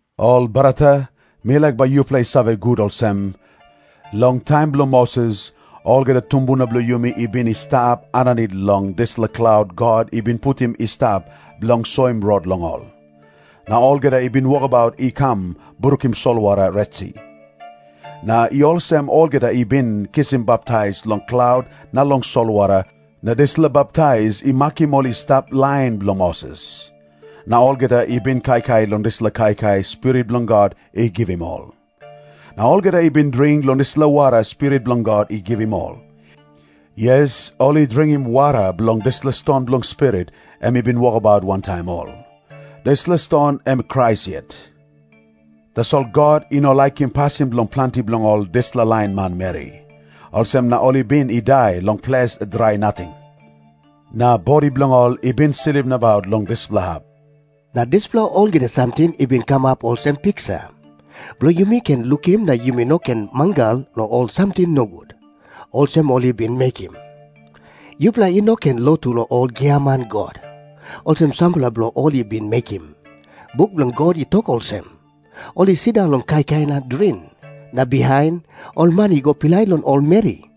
Ol brata, mi laik bai yupela i save gut olsem, long taim bilong Moses, olgeta tumbuna bilong yumi i bin i stap aninit long dispela klaut God i bin putim i stap bilong soim rot long ol. Na olgeta i bin wokabaut i kam brukim solwara Retsi. Na i olsem olgeta i bin kisim baptais long klaut na long solwara, na dispela baptais i makim ol i stap lain bilong Moses. Na olgeta i bin kaikai long dispela kaikai Spirit bilong God i givim ol. Na olgeta i bin dring long dispela wara Spirit bilong God i givim ol. Yes, ol i dringim wara bilong dispela ston bilong Spirit, em i bin wokabaut wantaim ol. Dispela ston em Krais yet. Tasol God i no laikim pasin bilong planti bilong ol dispela lain manmeri. Olsem na ol i bin i dai long ples drai nating, na bodi bilong ol i bin slip nabaut long dispela hap. Na dispela olgeta samting i bin kamap olsem piksa, bilong yumi ken lukim na yumi no ken mangal long ol samting nogut, olsem ol i bin mekim. Yupela i no ken lotu long ol giaman god, olsem sampela bilong ol i bin mekim. Buk bilong God i tok olsem, “Ol i sindaun long kaikai na dring, na bihain ol man i go pilai long ol meri.”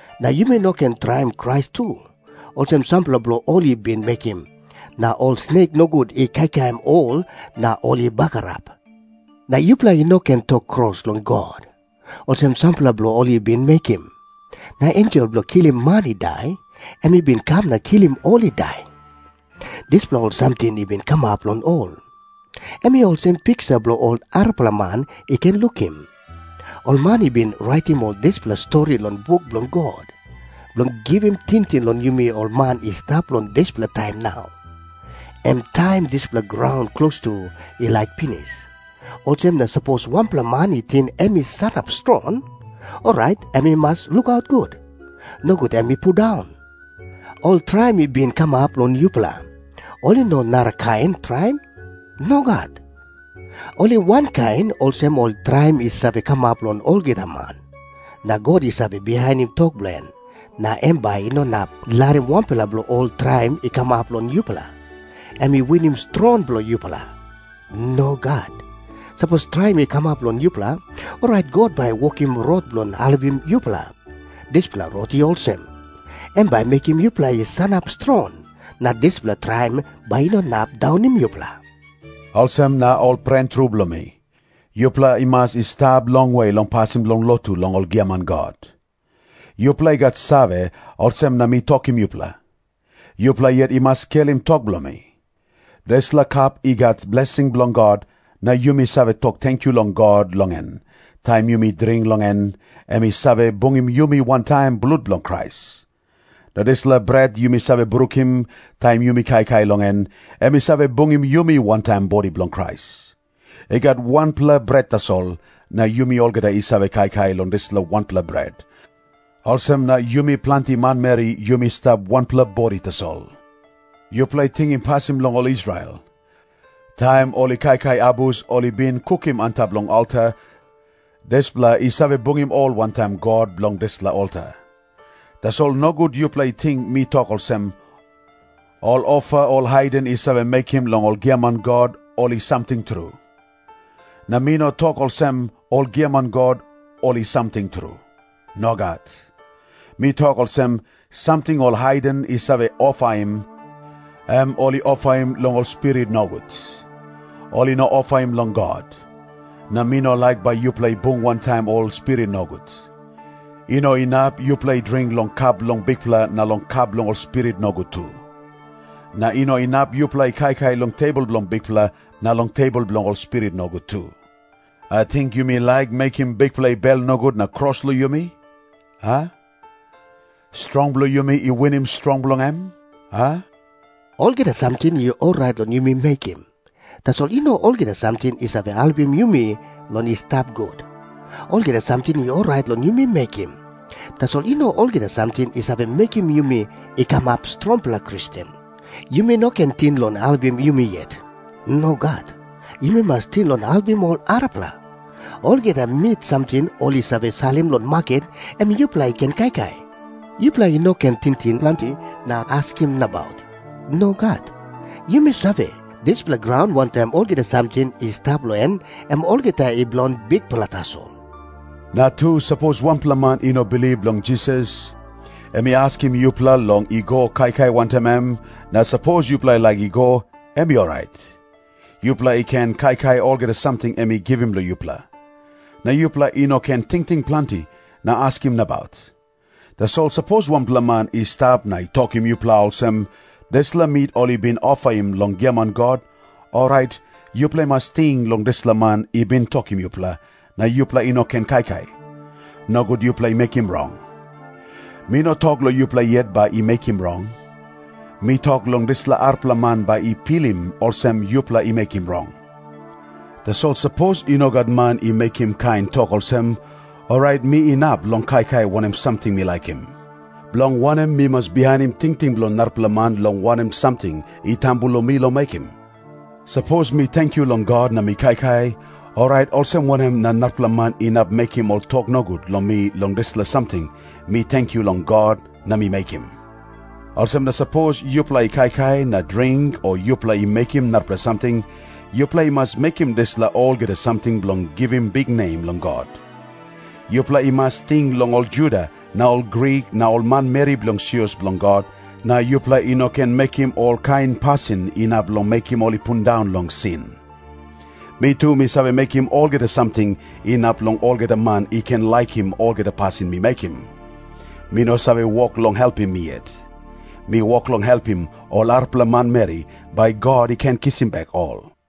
Na yumi no ken traim Krais tu, olsem sampela bilong ol i bin mekim, na ol snek nogut i kaikaim ol na ol i bagarap. Na yupela i no ken tok kros long God, olsem sampela bilong ol i bin mekim, na ensel bilong kilim man i dai, em i bin kam na kilim ol i dai. Dispela ol samting i bin kamap long ol, em i olsem piksa bilong ol arapela man i ken lukim. Ol man i bin raitim ol dispela stori long buk bilong God, bilong givim tingting long yumi ol man i stap long dispela taim nau, em taim dispela graun klostu i laik pinis. Olsem na sapos wanpela man i ting em i sanap strong, orait em i mas lukaut gut. Nogut em i pundaun. Ol traim i bin kamap long yupela, ol i no ol narakain traim. Nogat. Ol i wankain olsem ol traim i save kamap long olgeta man. Na God i save bihainim tok bilong en, na em bai i no inap larim wanpela bilong ol traim i kamap long yupela, em i winim strong bilong yupela. Nogat. Sapos traim i kamap long yupela, orait God bai i wokim rot bilong helpim yupela. Dispela rot i olsem. Em bai i mekim yupela i sanap strong, na dispela traim bai i no inap daunim yupela. Olsem na, ol pren tru bilong mi, yupela i mas i stap longwe long pasin bilong lotu long ol giaman god. Yupela i gat save, olsem na mi tokim yupela. Yupela yet i mas skelim tok bilong mi. Dispela kap i gat blesing bilong God, na yumi save tok tenkyu long God long en, taim yumi dring long en, em i save bungim yumi wantaim blut bilong Krais. Na dispela bret yumi save brukim, taim yumi kaikai long en, em i save bungim yumi wantaim bodi bilong Krais. I gat wanpela bret tasol, na yumi olgeta i save kaikai long dispela wanpela bret, olsem na yumi planti manmeri yumi stap wanpela bodi tasol. Yupela tingim pasin bilong ol Israel. Taim ol i kaikai abus ol i bin kukim antap long alta, dispela i save bungim ol wantaim God bilong dispela alta. Tasol nogut yupela i ting mi tok olsem, ol ofa ol haiden i save mekim long ol giaman god, ol i samting tru. Na mi no tok olsem ol giaman god, ol i samting tru. Nogat. Mi tok olsem. Samting ol haiden i save ofaim, em “ol i ofaim long ol spirit nogut. Ol i no ofaim long God.” Na mi no laik bai yupela i bung wantaim ol spirit nogut. I no inap yupela i dring long kap bilong Bikpela na long kap bilong ol spirit nogut tu. Na i no inap yupela i kaikai long tebol bilong Bikpela na long tebol bilong ol spirit nogut tu. Ating yumi laik mekim Bikpela i bel nogut na kros long yumi, a? Strong bilong yumi i winim strong bilong em, a? “Olgeta samting i orait long yumi mekim,” tasol i no olgeta samting i save helpim yumi long i stap gut. “Olgeta samting i orait long yumi mekim,” tasol i no olgeta samting i save mekim yumi i kamap strongpela Kristen. Yumi no ken ting long helpim yumi yet. Nogat. Yumi mas ting long helpim ol arapela. Olgeta mit samting ol i save salim long maket, em yupela i ken kaikai. Yupela i no ken tingting planti na askim nabaut. Nogat. Yumi save, “Dispela graun, wantaim olgeta samting i stap long en, em olgeta i bilong Bikpela tasol.” Na tu, sapos wanpela man i no bilip long Jisas, em i askim yupela long i go kaikai wantaim em, na sapos yupela i laik i go, em i orait. Yupela i ken kaikai olgeta samting em i givim long yupela. Na yupela i no ken tingting planti na askim nabaut. Tasol sapos wanpela man i stap na i tokim yupela olsem, “Dispela mit ol i bin ofaim long giaman god,” orait yupela i mas ting long dispela man i bin tokim yupela, na yupela i no ken kaikai. Nogut yupela i mekim rong. Mi no tok long yupela yet bai i mekim rong. Mi tok long dispela arapela man bai i pilim olsem yupela i mekim rong. Tasol sapos i no gat man i mekim kain tok olsem, orait mi inap long kaikai wanem samting mi laikim. Bilong wanem mi mas bihainim tingting bilong narapela man long wanem samting i tambu long mi long mekim? Sapos mi tenkyu long God na mi kaikai, orait olsem wanem na narapela man inap mekim ol tok nogut long mi long dispela samting mi tenkyu long God na mi mekim? Olsem na sapos yupela i kaikai na dring o yupela i mekim narapela samting, yupela i mas mekim dispela olgeta samting bilong givim biknem long God. Yupela i mas ting long ol Juda na ol Grik na ol manmeri bilong sios bilong God, na yupela i no ken mekim olkain pasin inap long mekim ol i pundaun long sin. Mi tu, mi save mekim olgeta samting inap long olgeta man i ken laikim olgeta pasin mi mekim. Mi no save wok long helpim mi yet. Mi wok long helpim ol arapela manmeri, bai God i ken kisim bek ol.